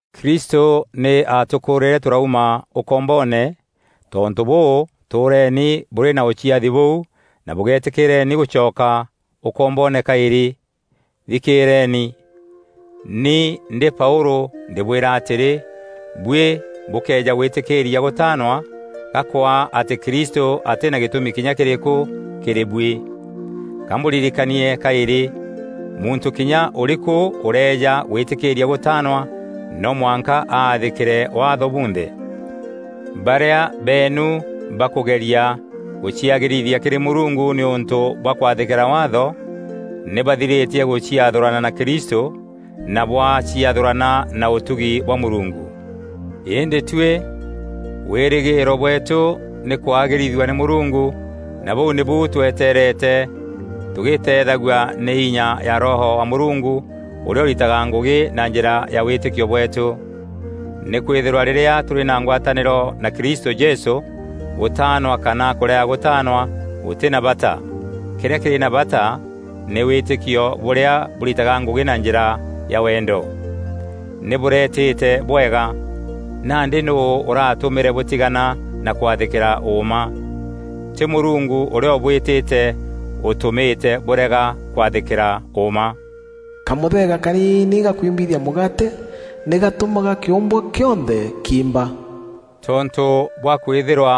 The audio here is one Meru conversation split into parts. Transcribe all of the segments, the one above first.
Kristû nî aatûkûûrîre tûrauma ûkomboone; tontû bûû tûûreni bûrî na ûciathi bûu na bûgeetîkîîrieni gûcoka ûkomboone kaîrî. Thikîîreni! Ni ndî Paûlû ndîbwîra atîrî, buî bûkëeja gwîtîkîîria gûtaanwa, ga kwaa atî Kristû atî na gîtûmi kinya kîrîkû kîrî buî. Ka mbûririkanie kaîrî: muntû kinya ûrîkû ûrëeja gwîtîkîîria gûtaanwa no mwanka aathîkîre Waatho bunthe. Barîa beenu bakûgeria gûciagîrithia kîrî Mûrungu nîûntû bwa kwathîkîra Waatho, nî bathirîtie gûciathûrana na Kristû na bwaciathûrana na ûtugi bwa Mûrungu. Îndî tuî, wîrîgîîro bweetû nî kwagîrithua nî Mûrungu na bûu nîbu tweteerete tugîîteethagua nî inya ya Roho wa Mûrungu ûrîa ûritaga ngûgî na njîra ya wîtîkio bweetû. Nîkwîthîrwa rîrîa tûrî na ngwatanîro na Kristû Jesû, gûtaanwa kana kûrega gûtaanwa gûtî na bata; kîrîa kîrî na bata nî wîtîkio bûrîa bûritaga ngûgî na njîra ya wendo. Nî bûreetîte bwega! Nandî nûû ûratûmîre bûtigana na kwathîkîra ûûma? Tî Mûrungu ûrîa ûbwîtîte ûtûmîte bûrega kwathîkîra ûûma. Kamûthega kaniini ga kwimbithia mûgaate nî gatûmaga kîûmbwa kîonthe kiimba. Tontû bwa kwîthîrwa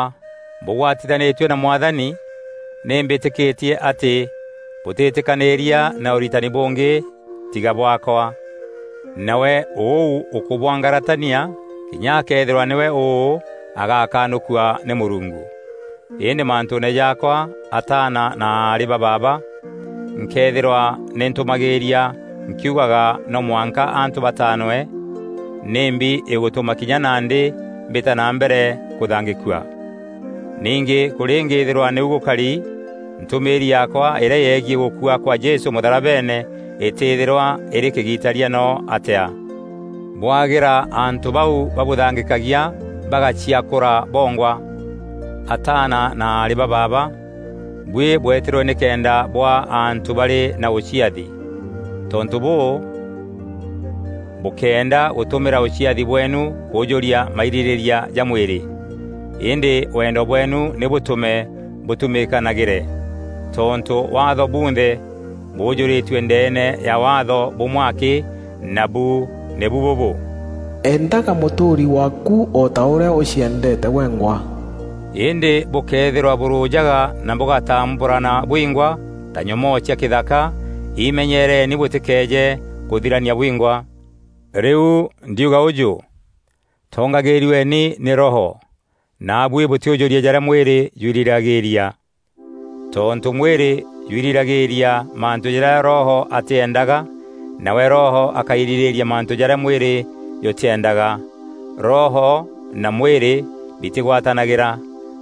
bûgwatithanîtue na Mwathani nî mbîtîkîtie atî bûtîtîkanîîria na ûritani bûngî tiga bwaakwa; nawe ûu ûkûbwangaratania kinya akëethîrwa nîwe ûû, agakanûkua nî Mûrungu. Îndî mantûûne jaakwa, ataana na aarî ba baaba, nkëethîrwa nî ntûmagîîria nkiugaga no mwanka antû bataanwe, nîmbi îgûtûma kinya nandî mbîta na mbere kûthangîkua? Ningî kûrîngîîthîrwa nîu gûkari, ntûmîîri yaakwa îrîa yegiî gûkua kwa Jesû mûtharabeene îtîthîrwa îrî kîgitaria no atîa. Bwagîra antû bau babûthangîkagia bagaciakûra bongwa! Ataana na aarî ba baaba, buî bwetîrwe nîkenda bûaa antû barî na ûciathi. Tontû bûû, bûkéenda gûtumîra ûciathi bweenu kûjûria mairîrîîria ja mwîrî. Îndî wendo bweenu nî bûtûme bûtumîkanagîre. Tontû Waatho bunthe bûjûrîtue ndeene ya Waatho bûmwe akî, nabu nîbu bûbû: “Endaga mûtûûri waaku o ta ûrîa ûciendeete gwengwa.” Îndî bûkëethîrwa bûrûjaga na bûgatambûrana bwingwa ta nyomoo cia kîthaka, imenyereeni bûtîkeeje kûthirania bwingwa. Rîu, ndiuga ûjû: tongagîîrueni nî Roho, naabuî bûtîûjûria jarîa mwîrî jwirîragîîria. Tontû mwîrî jwirîragîîria mantû jarîa Roho atîendaga nawe Roho akairîrîîria mantû jarîa mwîrî jûtîendaga. Roho na mwîrî bitîgwatanagîra;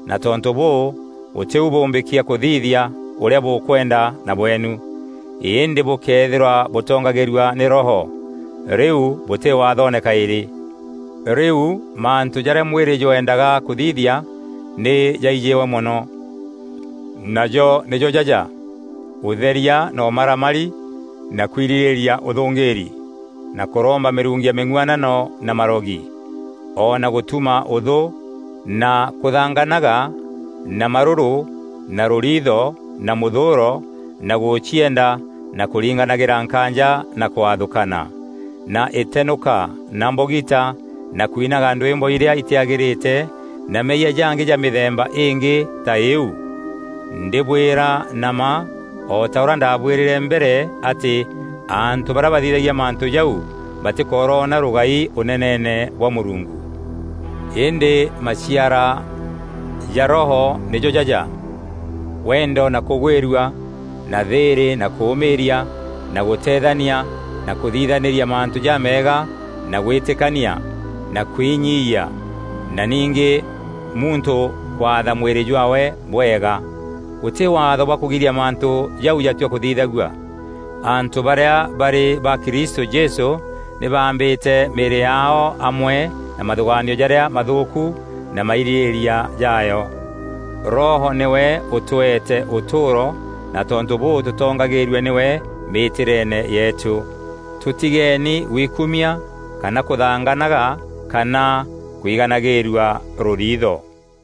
na tontû bûû, gûtî u bûmbîkia kûthithia ûrîa bûkwenda na bweenu. Îndî bûkëethîrwa bûtongagîrua nî Roho, rîu bûtî Waathoone kaîrî. Rîu mantû jarîa mwîrî jweendaga kûthithia nî jaijîwe mono, najo nîjo jaja: ûtheria na ûmaramari na kwirîrîîria ûthûngîîri na kûromba mîrungu ya mîng'uanano na marogi, o na gûtuma ûthû na kûthanganaga na marûrû na rûriitho na mûthûûro na gûcienda na kûringanagîra nkaanja na kwathûkana na îtenûka na mbogita na kwinaga ndwîmbo irîa itîagîrîte na meeyia jangî ja mîthemba îngî ta îîu. Ndîbwîra na mma, o ta ûrîa ndaabwîrîre mbere atî antû barîa bathithagia mantû jau batîkoroona rûgai ûneneene bwa Mûrungu. Îndî maciara ja Roho nîjo jaja: wendo na kûgwîrua na thîîrî na kûûmîîria na gûteethania na kûthithanîria mantû ja meega na gwîtîkania na kwinyiiyia na ningî muntû kwatha mwîrî jwaawe bwega. Gûtî waatho bwa kûgiria mantû jau jatua kûthithagua. Antû barîa barî ba Kristû Jesû nî baambîte mîîrî yaao amwe na mathûgaanio jarîa mathûûku na mairîrîîria jaayo. Roho nîwe ûtweete ûtûûro na tontû bûû tûtongagîîrue nîwe mîtîreene yeetû. Tûtigeeni gwikumia kana kûthanganaga kana kwiganagîîrua rûriitho.